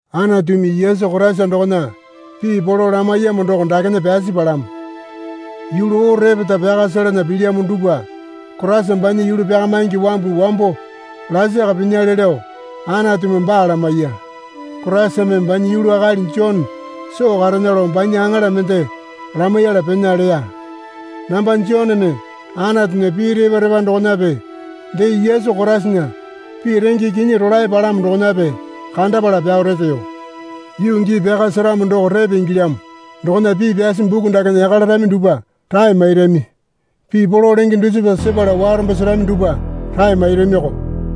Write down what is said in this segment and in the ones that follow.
Anatumi Yesu Koraisa dokona pii polo lamaiyamo doko dakena pyasi palamo. Yulu oo repeta pyaka selana pilyamo dupwa Koraisa banya yulu pyakamaingi wambu wambo lasaka pinyale lao Anatumi baa lamaiya. Koraisame banya yulu akali Jone soo karena lao banya aŋala mende lamaiyala pena leya. Namba Joneme Anatunya pii repa repa dokonape dee Yesu Koraisana pii renge kinyi rolae palamo dokonape kandapala pyao reteyo. Yuu gii pyaka seramo doko repe ingilyamo dokona pii pyasi buku dakena yaka larami dupwa rae mairami. Pii polo lenge dusipa sepala warombo serami dupwa rae mairamiko.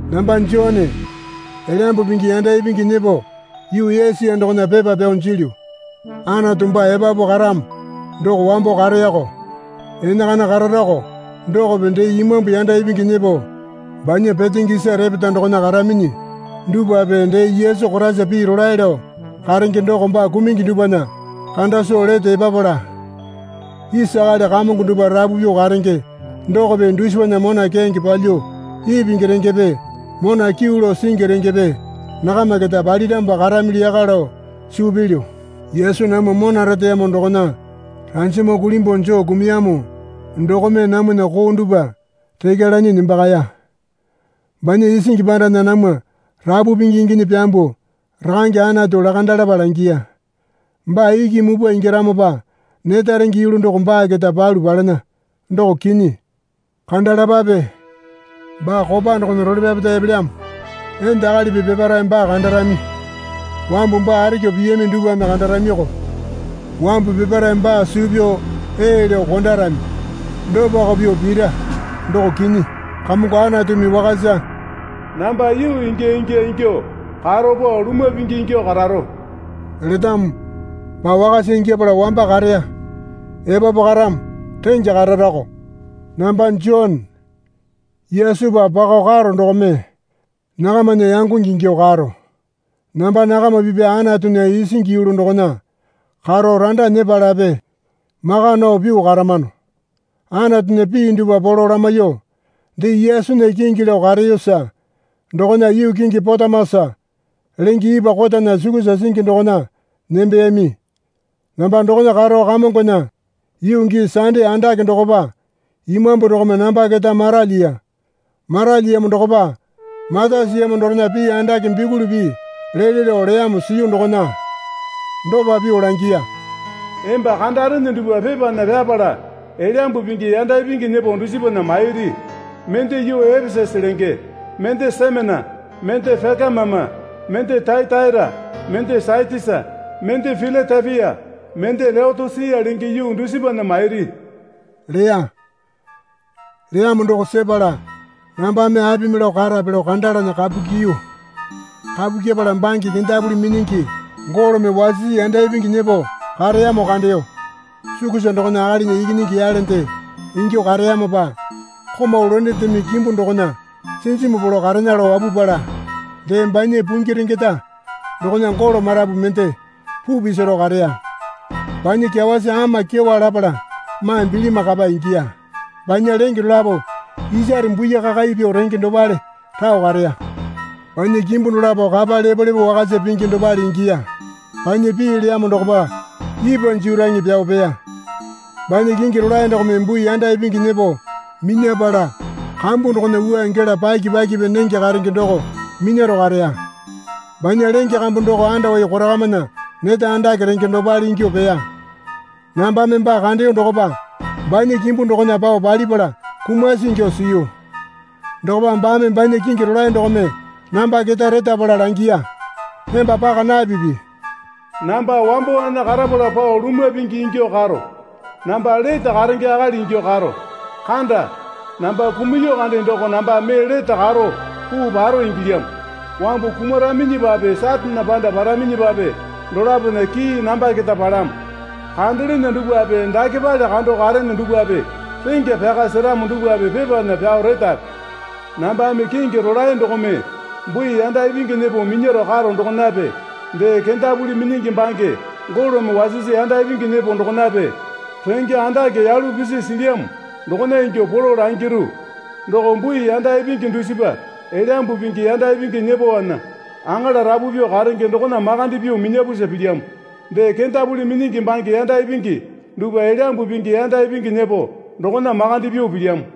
Namba Jone, Elyambu Pingi yanda ipingi nyepo yuu Esia dokona pepa pyao jilyu. Anatu baa epapu karamo doko wambo kareyako enakana kararako dokope dee imambu yanda ipingi nyepo banya petenge isa repeta dokona karaminyi dupwape dee Yesu Koraisa pii rolae lao karenge doko baa kumungi dupwana kanda soo lete epapala, isa akali kamongo dupwa rapu pyuo karenge dokope dusipana mona keyange palyuo ipingi rengepe mona kyuu lao singi rengepe nakama keta paliramopa karamili yaka lao suu pilyu. Yesu namwa mona reteyamo dokona ranjama kulimbuo joo kumuyamo dokome, namwana koo dupwa rekya lanyi nembakaya. Banya isingi pandana namwa rapu pingi inginyi pyambuo Rakange Anatu lakandalapa langiya. Baa iki mupwa ingyaramopa neta renge yulu doko baa keta palu palena, doko kinyi. Kandalapape, Baa kopa dokona role pyapeta epelyamo. Enda akalipi peparae baa kandarami. Wambu baa arekyuo piyami dupwame kandaramiyoko. Wambu peparae baa suu pyao ee lao kondarami. Dopako pyuo pira, doko kinyi. Kamongo Anatumi Wakasa, Namba yuu ingya ingya ingyuo karo pao lumwa pingi ingyuo kararo letamo. Baa wakasa ingyapala wamba kareya, epapu karamo rengya kararako. Namba Jone. Yesupa pakao karo dokome nakamana yangonge ingyuo karo. Namba nakama pipya Anatunya isingi yulu dokona karo randa nyepalape maka nao pyuo karamano. Anatunya pii dupwa polo lamaiyuo, dee Yesunya kingi lao kareyosa dokona yuu kingi Patamosa lenge ipwa kotana sukusa singi dokona nembeyami. Namba dokona karo Kamongona yuu gii sande andake dokopa Imambu dokome namba keta maralyiya. Maralyiyamo dokopa mata siyamo dorena pii andake bikuli pii lele lao leyamo siyu dokona dopa pyuo langiya. Emba kandarene dupwa pepana pyapala Elyambu Pingi yanda ipingi nyepo dusipana mairi. Mende yuu Epesasa lenge, mende Semena, mende Pekamama, mende Tayataira, mende Satisa, mende Pilatepia, mende Leotosia lenge yuu dusipana mairi leya. Leyamo doko sepala nambame apimi lao karape lao kandalana kapu kyiyu. Kapu kyepala bange kendapuli minyingi golome wasisi yanda ipingi nyepo kareyamo kandeyo. Sukusa dokona akalinya ikinyingi yalende ingyuo kareyamopa komau londendeme kimbu dokona sinjimu polo karena lao wapupala, dee banya puingi rengeta dokona golo marapu mende puu pisaro kareya. Banya kyawasi ama kyewa lapala maa bilima kapa ingiya. Banya lenge dolapo isare bui kakai pyuo renge dopale rao kareya. Banya kimbu dolapo kapa lepolepo wakasa pingi dopale ingiya. Banya pii leyamo dokopa ipwa jeraeŋe pyao peya. Banya kingi rolae dokome bui yanda ipingi nyepo minyapala kambu dokona wua gela paki pakipi nenge karenge doko minyaro kareya. Banya lenge kambu doko andowai korakamana neta andake renge dopale ingyuo peya. Nambame baa kandeyo dokopa banya kimbu dokona pao palipala kumasi ingyuo siyu. Dokopa baame banya kingi rolae dokome namba keta retapala langiya. Emba paka napipi. Namba wambowana karapala pao lumwa pingi ingyuo karo. Namba lete karenge akali ingyuo karo. Kanda. Namba kumuya kande doko nambame mee lete karo puu paro ingilyamo. Wambu kumaraminyipape Satane panda paraminyipape dolapona kii namba keta palamo. Kandalene dupwape dakepale kando karene dupwape rengya pyaka seramo dupwape pepana pyao retape. Nambame kingi rolae dokome bui yanda ipingi nyepo minyaro karo dokonape dee kendapuli minyingi bange golome wasisi yanda ipingi nyepo dokonape renge andake yalu pisi silyamo dokona ingyuo polo langiru. Doko bui yanda ipingi dusipa Elyambu Pingi yanda ipingi nyepowana aŋala rapu pyuo karenge dokona makande pyuo minyapusa pilyamo. Dee kendapuli minyingi bange yanda ipingi dupwa Elyambu Pingi yanda ipingi nyepo dokona makande pyuo pilyamo.